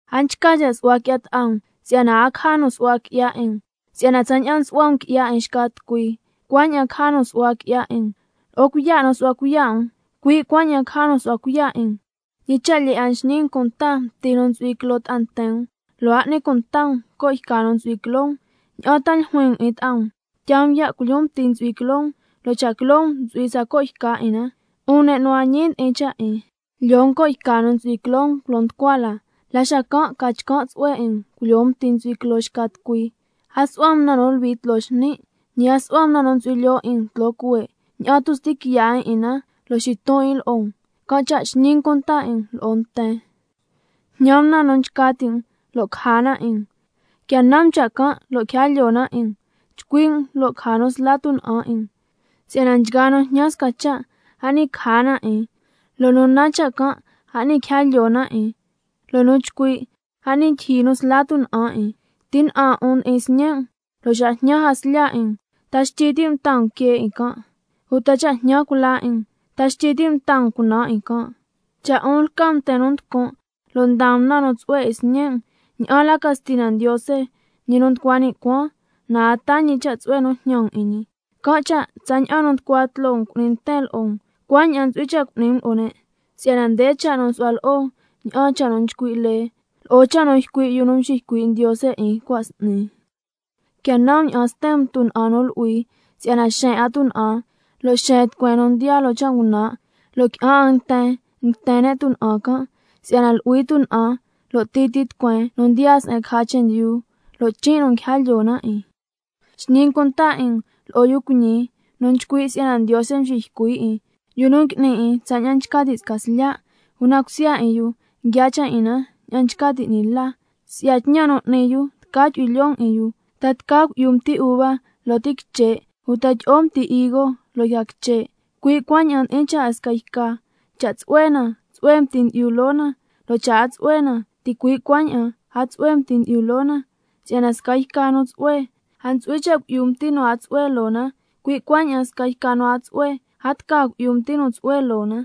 A nchca cha' su'hua qui'ya ta'a um, si'yana a caja nu su'hua qui'ya 'in um. Si'yana tsaña'an nsu'hua um qui'ya 'in xca tucui, cuaña'an caja nu su'hua qui'ya 'in um, lo'o cuiya' nu nsu'hua cuiya' um, cui' cuaña'an caja nu su'hua cuiya' 'in um. ¿Ñi cha' lyee 'a nxñi um cunta mti nu ntsu'hui quiloo ta'a nten um, lo' a n'ni cunta um co' yca nu ntsu'hui quiloo um? ¿Ña'an ta tca ljuin um 'in ta'a um: Tyaa um ya' culyoon mti nu ntsu'hui quiloo um, lo' cha' quiloo um ntsu'hui sca co' yca 'in na? 'Un ne' nu a ñi ndi'in cha' 'in, lyoo um co' yca nu ntsu'hui quiloo um culo nducua la, la xacan' ca chcan' tsu'hue 'in um culyoo um mti nu ntsu'hui quiloo xca tucui. A su'hua um na nu luhui tloo xni', ñi a su'hua um na nu ntsu'hui lyoo 'in um tloo cuhue', ña'an tu' sti quiya' 'in 'in na, lo' xiton 'in lo'o um, can' cha' xñi um cunta 'in um lo'o nten. Jñan um na nu nchca ti' um, lo' caja na 'in um, quia nan um cha' can' lo' quija lyoo na 'in um, chcui' um lo' caja nu sla tuna'an 'in um. Si'yana nchgaa nu jñan sca cha', a s'ni caja na 'in, lo' nu nan cha' can', a s'ni quija lyoo na 'in, lo' nu nchcui', a s'ni ndyijyi nu sla tuna'an 'in. ¿Ti ña'an um ndi'in sñe' um, lo' xa jñan jaslya 'in um, ta xtyi ti' um taa um quee 'in can'? ¿Uta cha' jñan cula 'in um, ta xtyi ti' um taa um cunaan 'in can'? Cha' 'un lca um nten nu nducun', lo' ndaa um na nu tsu'hue 'in sñe' um, ¿ña'an la ca Stina Ndiose, ñi nu nducua ni' cuaan, na a taa ñi cha' tsu'hue nu jñan um 'in ñi? Can' cha', tsaña'an nu nducua tloo um cu'ni nten lo'o um, cuaña'an ntsu'hui cha' cu'ni um lo'o ne', si'yana nde cha' nu nsu'hua lo'o ña'aan cha' nu nchcui' lee lo'o cha' nu ycui' yu nu mxiycui' Ndiose 'in cua' s'ni. Quia nan um ña'an sten um tuna'an nu lu'hui, si'yana xeen 'a tuna'an lo' xeen tucueen nu ndiyaa loo cha' ngunan', lo' qui'an 'a nten nguiten ne' tuna'an can'. Si'yana lu'hui tuna'an lo' titi tucueen nu ndiyaa se'en caja chendyu, lo' chin' nu nguija lyoo na 'in. Xñi um cunta 'in um lo'o yu cuiñi nu nchcui' si'yana Ndiose nxiycui' 'in, yu nu ngui'ni 'in tsaña'an nchca ti' sca slya', una cusya 'in yu nguia cha' 'in na ña'an nchca ti' 'ni la. Si'ya tñan nu n'ni yu tca chu'hui lyoo um 'in yu. ¿Ta tca cui'yu mti uva loo ti quiche', uta tyi'o mti higo loo yca quiche'? Cui' cuaña'an ndi'in cha' 'in sca yca: Cha' tsu'hue na, tsu'hue mti ndyi'yu loo na, lo' cha' a tsu'hue na, ticui' cuaña'an a tsu'hue mti ndyi'o loo na. Si'yana sca yca nu tsu'hue, a ntsu'hui cha' cui'yu mti nu a tsu'hue loo na, cui' cuaña'an sca yca nu a tsu'hue, a tca cui'yu mti nu tsu'hue loo na.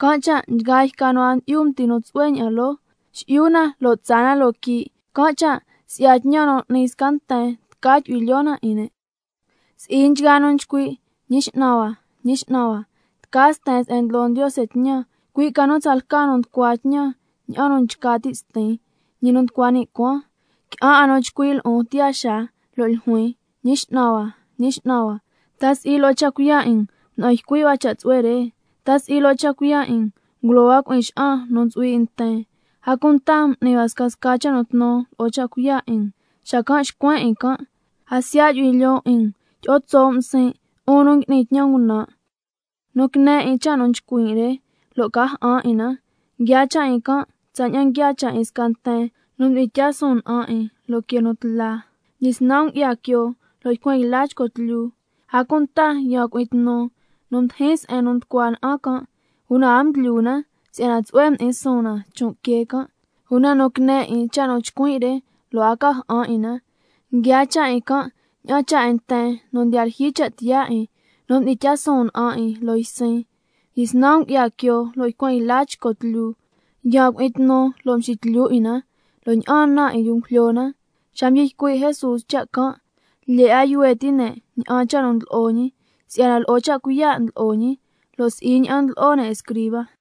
Can' cha' nchgaa yca nu a ndyi'yu mti nu tsu'hue ña'an loo, xi'yu na lo' tsaa na loo quii'. Can' cha' si'ya tñan nu n'ni sca nten tca chu'hui lyoo na 'in ne'. Si'i nchgaa nu nchcui': Ñi X'nan hua, Ñi X'nan hua, tca sten se'en ndlo Ndiose tñan, cui' ca nu tsalca nu nducua tñan ña'an nu nchca ti' Stin, ñi nu nducua ni' cuaan. Qui'an 'a nu chcui' lo'on tiyaa xaa, lo' ljuin: Ñi X'nan hua, Ñi X'nan hua, ¿ta si'i lo'o cha' cuiya' 'in um mda'an ycui' hua cha' tsu'hue re? ¿Ta si'i lo'o cha' cuiya' 'in um ngulo hua cui'in xa'an nu ntsu'hui 'in nten? ¿A cunta m'ni hua scasca cha' nu tnu lo'o cha' cuiya' 'in um? Xacan' xcuen 'in can': —A siya' yu'hui lyoon 'in um, tyi'o tso' um siin', 'un nu ngui'ni tñan ngunan'—. Nu quine 'in cha' nu nchcuin' re, lo' ca ja'an 'in na, nguiaa cha' 'in can' tsaña'an nguiaa cha' 'in sca nten nu mdi'in tyaa suun na'an 'in loo quee nu tla. Mdyisnan ngu'ya quioo lo' ycuen yla chco tlyu, a cunta yaan cui'in tnu nu mdijin se'en nducua na'an can', una a mdlyu na si'yana tsu'hue mdi'in suun na chon' quee can'. Una nu quine 'in cha' nu nchcuin' re, lo' a ca ja'an 'in na, nguiaa cha' 'in can' ña'an cha' 'in nten nu ndiya lyijyi cha' tiyaa 'in, nu mdi'in tyaa suun na'an 'in loo ysin. Mdyisnan ngu'ya quioo lo' ycuen yla chco tlyu, yaan cui'in tnu lo' mxitlyu 'in na, lo' ña'aan na 'in yu ngujlyo na. Xa mdyi ycui' Jesús cha' can', lyee 'a yuhue ti' ne' ña'an cha' nu ndlo'o ñi, si'yana lo'o cha' cuiya' ndlo'o ñi, lo' si'i ña'an ndlo'o ne' escriba.